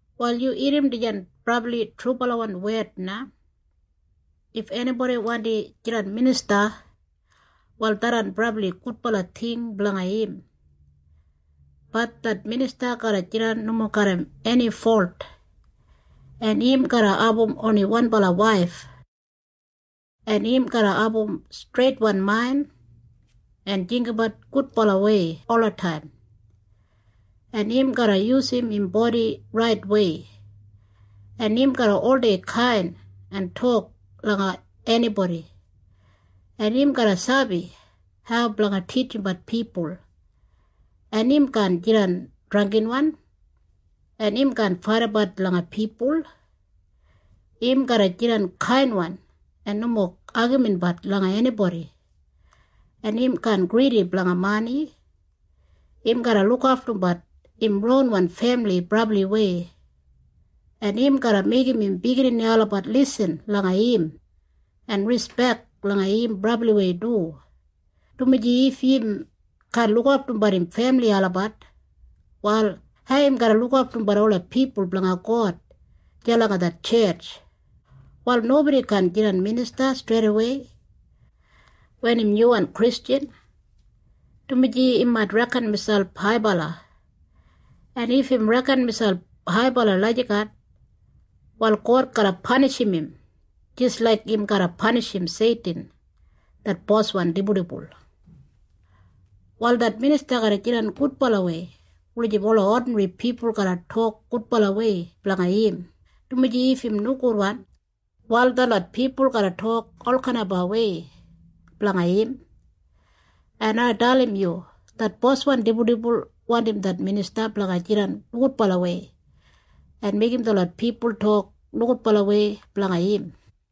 Wal yu irrim dijan brabli trubalawan wed na. If enibodi wandi jidan minista, wal tharran brabli gudbala ting blanga im. Bat det minista garra jidan nomo garram eni folt, en im garra abum oni wanbala waif, en im garra abum streitwan main en jinggabat gudbalawei olataim, en im garra yusum im bodi raitwei, en im garra oldei kain en tok langa enibodi, en im garra sabi hau blanga titjimbat pipul, en im kaan jidan drangginwan, en im kaan faidabat langa pipul. Im garra jidan kainwan en nomo agaminbat langa enibodi, en im kaan gridi blanga mani. Im garra lukaftumbat im ronwan femili brabliwei, en im garra meigim im biginini olabat lisin langa im en rispek langa im brabliwei du, dumaji if im kaan lukaftumbat im femili olabat, wal hau im garra lukaftumbat ola pipul blanga God deya langa det tjetj? Wal nobodi kaan jidan minista streidawei wen im nyuwan Kristjan, dumaji im mait reken miselp haibala. En if im reken miselp haibala lagijat, wal God garra panishim im jis laik im garra panishim Seitin det boswan dibuldibul. Wal det minista garra jidan gudbalawei wulijim ola odinri pipul garra tok gudbalawei blanga im, dumaji if im nogudwan, wal detlot pipul garra tok olkainwei blanga im. En ai dalim yu. Det boswan dibuldibul wandim det minista blanga jidan nogudbalawei en meigim detlot pipul tok nogudbalawei blanga im.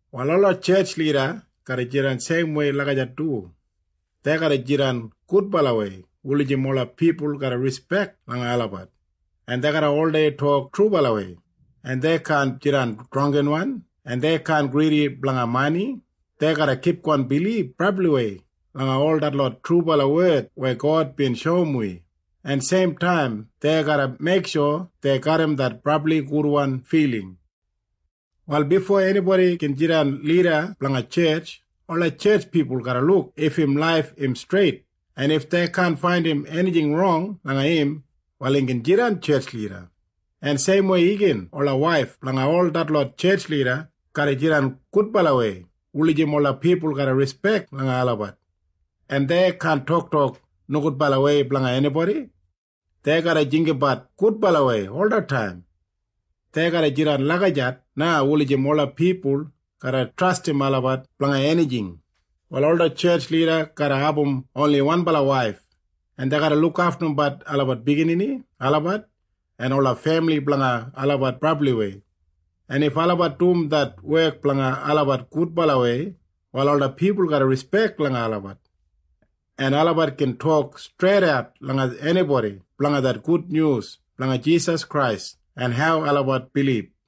Wal ola tjetj lida garra jidan seimwei lagijat du. Dei garra jidan gudbalawei wulijim ola pipul garra rispek langa olabat, en dei garra oldei tok trubalawei, en dei kaan jidan drangginwan, en dei kaan gridi blanga mani. Dei garra kipgon bilib brabliwei langa ol detlot trubala wed weya God bin shoum wi, en seimtaim dei garra meiksho dei garram det brabli gudwan filing. Wal bifo enibodi gin jidan lida blanga tjetj, ola tjetj pipul garra luk if im laif im streit, en if dei kaan faindim enijing rong langa im, wal im gin jidan tjetj lida. En seimwei igin ola waif blanga detlot tjetj lida garra jidan gudbalawei wulijim ola pipul garra rispek langa olabat, en dei kaan toktok nogudbalawei blanga enibodi. Dei garra jinggabat gudbalawei olataim. Dei garra jidan lagijat na wulijim ola pipul garra trastim olabat blanga enijing. Wal ola tjetj lida garra abum oni wanbala waif, en dei garra lukaftumbat olabat biginini olabat en ola femili blanga olabat brabliwei. En if olabat dum det wek blanga olabat gudbalawei, wal ola pipul garra rispek langa olabat, en olabat gin tok streidat langa enibodi blanga det gudnyus blanga Jisas Krais en hau olabat bilib.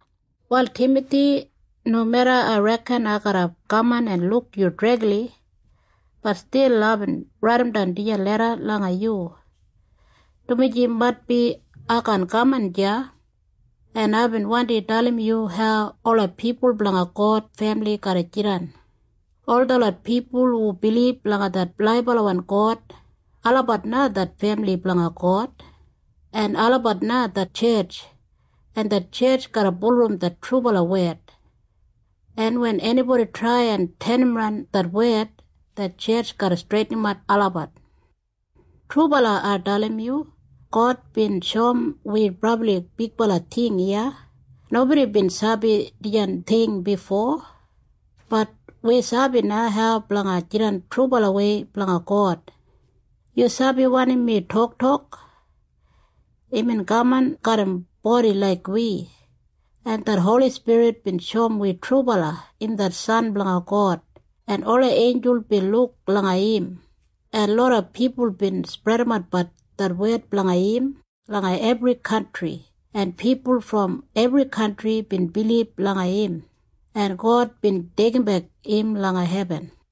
Wal Timathi, nomeda ai reken ai garra kaman en luk yu dregli, bat stil aibin raidimdan dijan leda langa yu, dumaji maitbi ai kaan kaman deya, en aibin wandi dalim yu hau ola pipul blanga God femili garra jidan. Ol detlot pipul hu bilib langa det laibalawan God, olabat na det femili blanga God, en olabat na det tjetj, en det tjetj garra bulurrum det trubala wed. En wen enibodi trai en tenimran det wed, det tjetj garra streitinimat olabat. Trubala ai dalim yu. God bin shoum wi brabli bigbala ting iya. Nobodi bin sabi dijan ting bifo. Bat wi sabi na hau blanga jidan trubalawei blanga God. Yu sabi wanim mi toktok? Imbin kaman garram bodi laik wi, en det Holi Spirit bin shoum wi trubala im det San blanga God, en ola einjul bin luk langa im, en loda pipul bin spredimatbat det wed blanga im langa ebri kantri, en pipul brom ebri kantri bin bilib langa im, en God bin deigimbek im langa hebin.